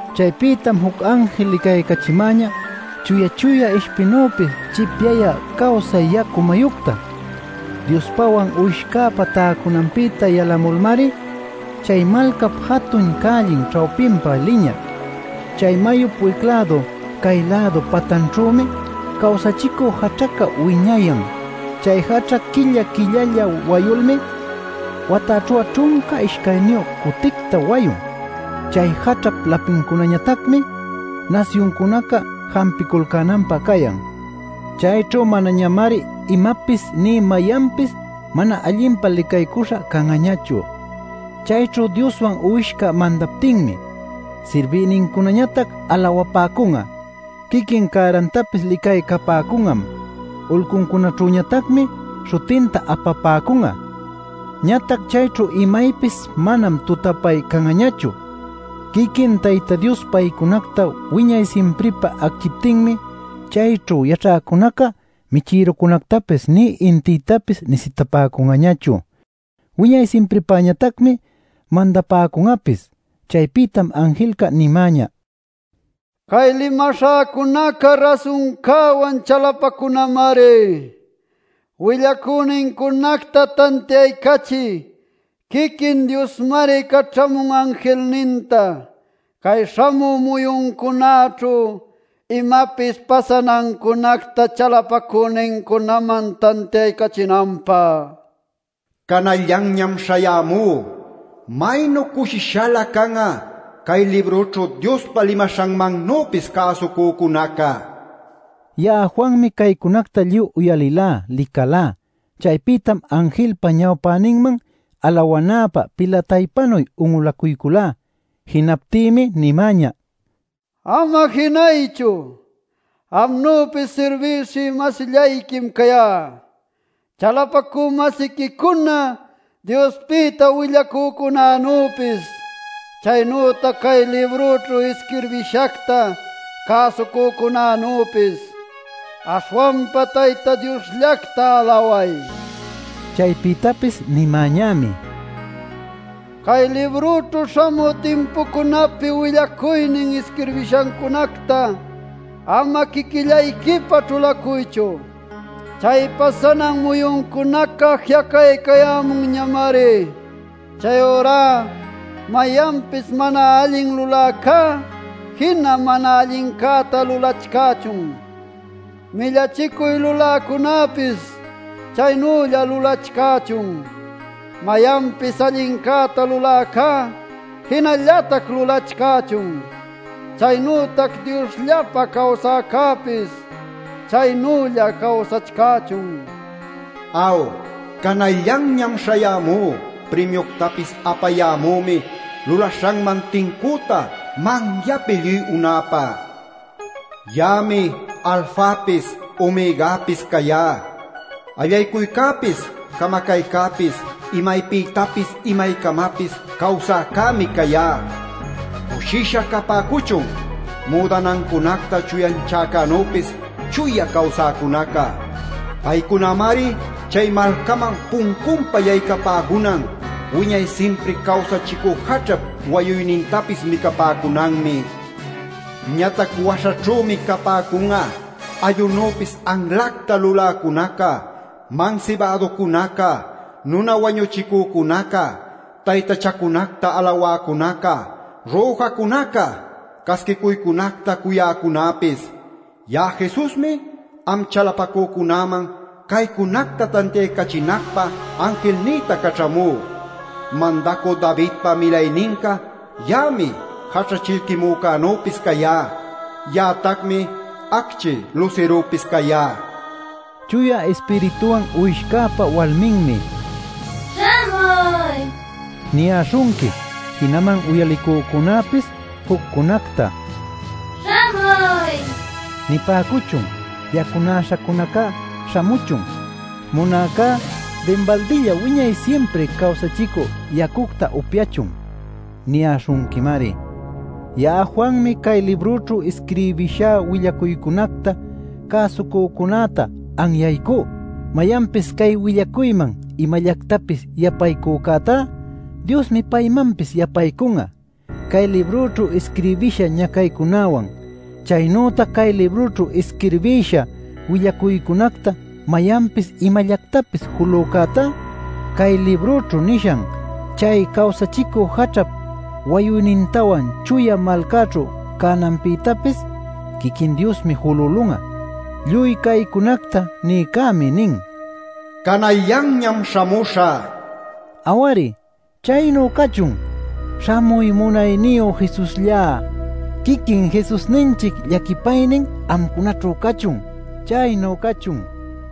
Chaypïtam juc anjil licaycachimäñä chuya-chuya ishpinüpis chipyayä cawsay yacu mayucta. Diospawan Uwishcäpa täcunanpïta yalamulmari chay malcap jatun cällin ćhawpinpa liñä. Chay mayup wic-lädu cay-lädu patanćhümi cawsachicü jaćhaca wiñayan. Chay jaćha quilla-quillalla wayulmi, watäćhu'a ćhunca ishcayniyu cuticta wayun. Chay jaćhap lapincunañatacmi nasyuncunaca jampiculcänanpä cayan. Chayćhu manañamari imapis nï mayanpis mana allinpa licaycuśha can'añachu. Chayćhu Dioswan Uwishca mandaptinmi sirbïnincunañatac alawapäcun'a. Quiquin cärantapis licaycapäcun'am, ulcuncunaćhüñatacmi śhutinta apapäcun'a. Ñatac chayćhu imaypis manam tutapay can'añachu; quiquin Tayta Dios paycunacta wiñay simpripä acchiptinmi chayćhu yaćhäcunaca michïrucunactapis nï intïtapis nisitapäcun'añachu. Wiñay simpripäñatacmi mandapäcun'apis. Chaypïtam anjilca nimäñä: “Cay limaśhäcunaca rasuncäwan chalapacunamari. Willacünincunacta tantiaycachï quiquin Diosmari caćhämun anjilninta cay śhamü muyuncunäćhu imapis pasanancunacta chalapacünincunaman tantiaycachinanpä. “Canallanñam śhayämú. Maynu cushishalä can'a cay librućhu Diospa limaśhanmannüpis cäsucücunaca” nil. Ya'a Juanmi caycunacta lluy uyalilá, licalá. Chaypïtam anjilpa ñawpäninman alawanäpä pilataypanu un'ulacuyculá. Jinaptïmi nimäñä: “Ama jinaychu. Amnüpis sirbiwshï-masillayquim cayá, chalapacü-masiquicuna Diospïta willacücunänüpis, chaynütac cay librućhu isquirbishacta cäsucücunänüpis. Aśhwanpa Tayta Diosllacta alaway” nil. Chaypïtapis nimäñämi: “Cay librućhu śhamü timpucunapi willacuynin isquirbishancunacta ama quiquillayquipá ćhulacuychu. Chay pasanan muyuncunaca ji'acaycayämunñamari. Chayurá mayanpis mana allin luläcá jina mana allincäta lulachcächun; millachicuy luläcunäpis chaynülla lulachcächun. Mayanpis allincäta luläcá jinallatac lulachcächun. Chaynütac Diosllapa cawsäcäpis chaynülla cawsachcächun. “Aw, canallanñam śhayämú. Primiuctapis apayämümi lulaśhanman tincüta manyapi lluy unäpä. Ya'ami Alfapis Omegapis cayá; allaycuycäpis camacaycäpis, imaypïtapis imaycamapis cawsäcämi cayá. “Cushisha capäcuchun müdanancunacta chuyanchäcänüpis chuya cawsäcunaca. Paycunamari chay malcaman puncunpa yaycapäcunan; wiñay simpri cawsachicü jaćhap wayuynintapis micapäcunanmi. Ñatac waśhaćhümi capäcun'a: allunüpis anlacta luläcunaca, mansibäducunaca, nuna wañuchïcucunaca, taytachacunacta alawäcunaca, rüjacücunaca, casquicuycunacta cuyäcunapis. “Ya'a Jesusmi am chalapacücunäman caycunacta tantiaycachinacpä anjilnïta caćhämú. Mandacü Davidpa milayninca ya'ami Jaćha Chillquimücänüpis cayá. Ya'atacmi Acchi Lusirupis cayá” nin. Chuya Ispirituwan Uwishcäpa walminmi “Śhamuy” niyäśhunqui. Jinaman uyalicücunapis juccunacta “Śhamuy” nipäcuchun. “Yacunäśhacunaca śhamuchun; munäcá dinbaldilla wiñay simpri cawsachicü yacucta upyachun” niyäśhunquimari. Ya'a Juanmi cay librućhu isquirbïshá willacuycunacta cäsucücunäta anyaycú: Mayanpis cay willacuyman imallactapis yapaycücätá, Diosmi paymanpis yapaycun'a cay librućhu isquirbïsha ñacaycunäwan. Chaynütac cay librućhu isquirbïsha willacuycunacta mayanpis imallactapis julücätá, cay librućhu nishan chay cawsachicü jaćhap wayuynintawan chuya malcaćhu cananpïtapis quiquin Diosmi julülun'a. Lluy caycunacta nïcämi nin: “Canallanñam śhamuśhä” nil. Aw-ari. ¡Chaynu cachun! ¡Śhamuy, munayniyu Jesusllá! Quiquin Jesusninchic llaquipaynin amcunaćhu cachun. ¡Chaynu cachun!